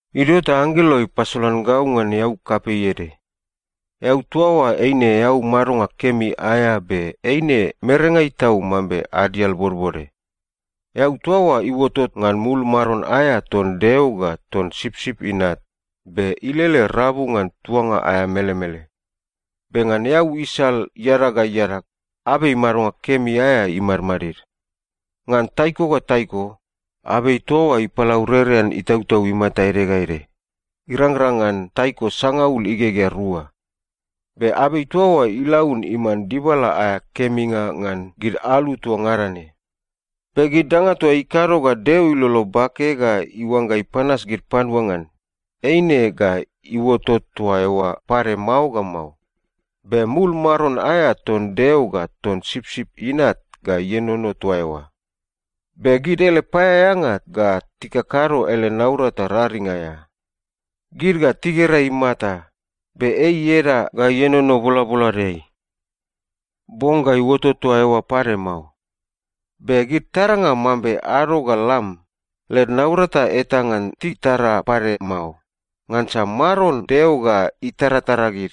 Idio ta anggelo ipasolan gau ngan eau kapei ede. Eau toa oa eine eau madonga kemi aea be eine merengai tau mambe adial bodbode. Eau toa oa iuotot ngan mul maron aea ton Deo ga ton Sipsip Inat be ilele rabu ngan tuanga aea melemele. Be ngan eau isal iadag ga iadag, abei madonga kemi aea imadmadid. Ngan taiko ga taiko, abei toa oa ipalaurerean itautau imata ede ga ede, irangrang ngan taiko sangaul igegea rua. Be abei toa oa ilaun iman dibala aea keminga ngan gid alu toa ngada ne. Be gid danga toa ikado ga Deo ilolo bake ga iuangga ipanas gid panua ngan, eine ga iuotot toa eoa pade mao ga mao. Be mul maron aea ton Deo ga ton Sipsip Inat ga ienono toa eoa. Be gid ele paeaeanga ga tikakado ele naurata raring aea. Gid ga tigera imata, be ei ieda ga ienono bolaboladeai. Bong ga iuotot toa eoa pade mao. Be gid taranga mambe ado ga lam, led naurata eta ngan titara pade mao, ngansa Maron Deo ga itaratara gid.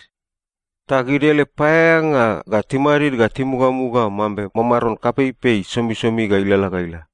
Ta gid ele paeaeanga ga timadid ga timugamuga mambe mamaron kapeipei somisomi ga ilalala ga ila.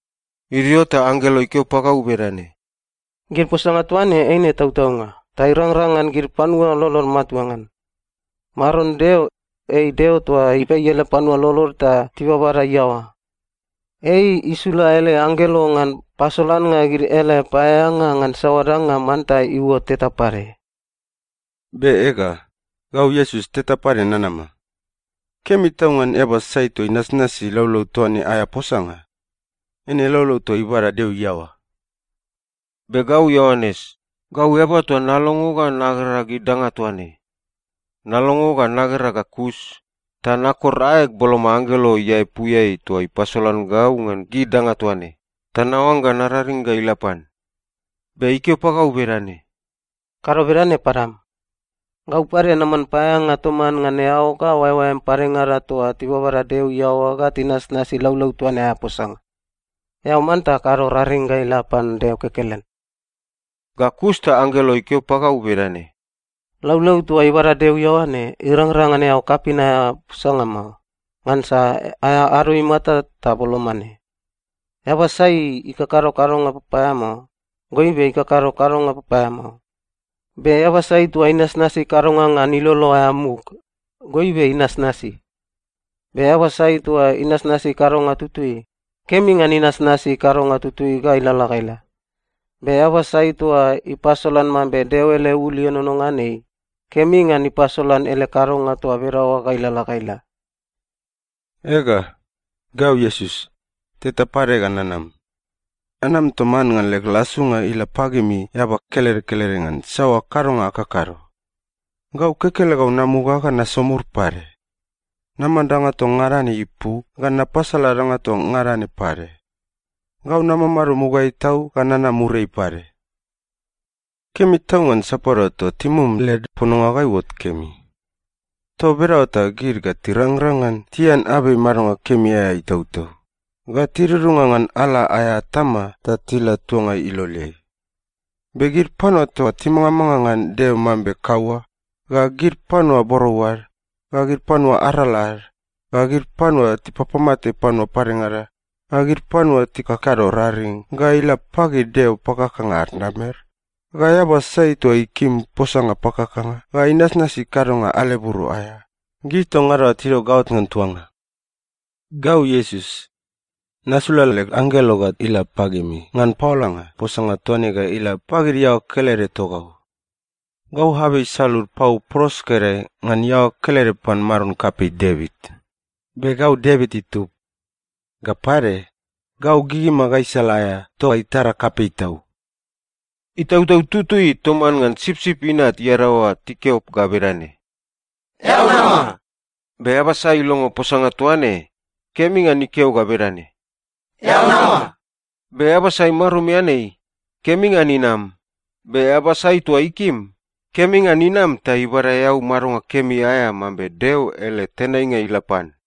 Idio ta anggelo ikeo pagau bedane, “Gid posanga toa ne eine tautaunga ta irangrang ngan gid panua lolod matua ngan. Maron Deo, ei Deo toa ipei ele panua lolod ta tibabada iaoa. Ei isula ele anggelo ngan pasolannga gid ele paeaeanga ngan saoa danga manta iuot teta pade.” “Be ega, gau Iesus teta pade nanama! Kemi tau ngan eaba sai toa inasnasi laulau toa ne aea posanga. Eine laulau toa ibada Deo iaoa.” Be gau Ioanes, gau eaba toa nalongo ga nagera gid danga toa ne. Nalongo ga nagera ga kus, ta nakor aeg boloma anggelo iaepuiai toa ipasolan gau ngan gid danga toa ne, ta naoangga nararing ga ila pan. Be ikeo pagau bedane, “Kado bedane padam! Gau pade naman paeaeanga toman ngan eao ga oaeoaem padengada toa tibabada Deo iaoa ga tinasnasi laulau toa ne aea posanga. Eao manta kado raring ga ila pan Deo kekelen.” Ga kus ta anggelo ikeo pagau bedane, “Laulau toa ibada Deo iaoa ne, irangrang ngan eao kapin aea posanga mao. Ngansa aea ado imata ta boloma ne. Eaba sai ikakado kadonga papaeamao, goibe ikakado kadonga papaeamao. Be eaba sai toa inasnasi kadonga ngan ilolo aea muk, goibe inasnasi. Be eaba sai toa inasnasi kadonga tutui, kemi ngan inasnasi kadonga tutui ga ilalala ga ila. Be eaba sai toa ipasolan mambe Deo ele ul ienono ngan ei, kemi ngan ipasolan ele kadonga toa bedaoa ga ilalala ga ila. “Ega, gau Iesus, teta pade ga nanam. Nanam toman ngan leg lasunga ila pagimi eaba kelede kelede ngan saoa kadonga akakado. Gau kekelegau namuga ga nasomur pade. Naman danga toa ngada ne ipu ga napasala danga toa ngada ne pade. Gau namamado mugaeai tau ga nanam muriai pade. “Kemi tau ngan sapadua toa timum led pononga ga iuot kemi. Toa bedaoa ta gid ga tirangrang ngan tian abei madonga kemi aea itautau, ga tidudunga ngan ala aea atama ta tila tuanga iloleai. Be gid panua toa timangamanga ngan Deo mambe kaua, ga gid panua borou ad, ga gid panua arala ad, ga gid panua tipapamate panua padengada, ga gid panua tikakado raring ga ila pagid deo pakakanga ad namer, ga eaba sai toa ikim posanga pakakanga ga inasnasi kadonga aleburo aea, gid toa ngada oa tidio gaot ngan tuanga. “Gau Iesus, nasula leg anggelo ga ila pagimi ngan paolanga posanga toa ne ga ila pagid iaoa kelede togau. Gau abei isalud pau pros ga idae ngan iaoa kelede pan maron kapei Devit, be gau Devit itub. Ga pade, gau gigima gaisala aea toa itara kapei tau.” Itautau Tutui toman ngan Sipsip Inat iadaoa tikeo ga bedane, “Eao nama!” Be eaba sai ilongo posanga toa ne, kemi ngan ikeo ga bedane, “Eao nama!” Be eaba sai marumian ei, kemi ngan inam, be eaba sai toa ikim, kemi ngan inam ta ibada eau madonga kemi aea mambe Deo ele tenainga ila pan.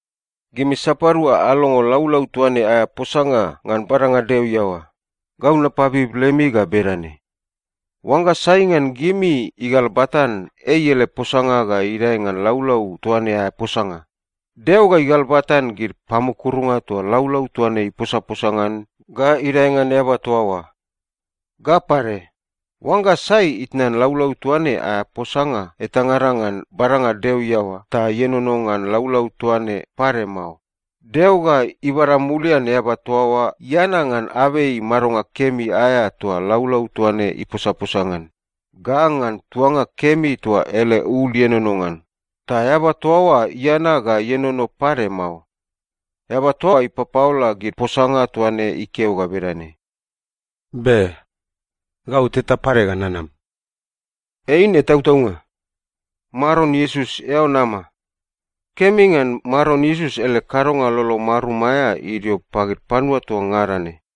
Gimi sapadua alongo laulau toa ne aea posanga ngan badanga Deo iaoa, gau napabib lemi ga bedane: Oangga sai ngan gimi igalbatan ei ele posanga ga idae ngan laulau toa ne aea posanga, Deo ga igalbatan gid pamukurunga toa laulau toa ne iposaposa ngan ga idae ngan eaba toa oa. Ga pade, oangga sai itnan laulau toa ne aea posanga etangada ngan badanga Deo iaoa ta ienono ngan laulau toa ne pade mao, Deo ga ibada mulian eaba toa oa iana ngan abei madonga kemi aea toa laulau toa ne iposaposa ngan, ga ngan tuanga kemi toa ele ul ienono ngan, ta eaba toa oa iana ga ienono pade mao. Eaba toa ipapaola gid posanga toa ne ikeo ga bedane, “Be. Gau teta pade ga nanam.” Eine tautaunga. Maron Iesus, eao nama! Kemi ngan Maron Iesus ele kadonga lolo marum aea idio pagid panua toa ngada ne.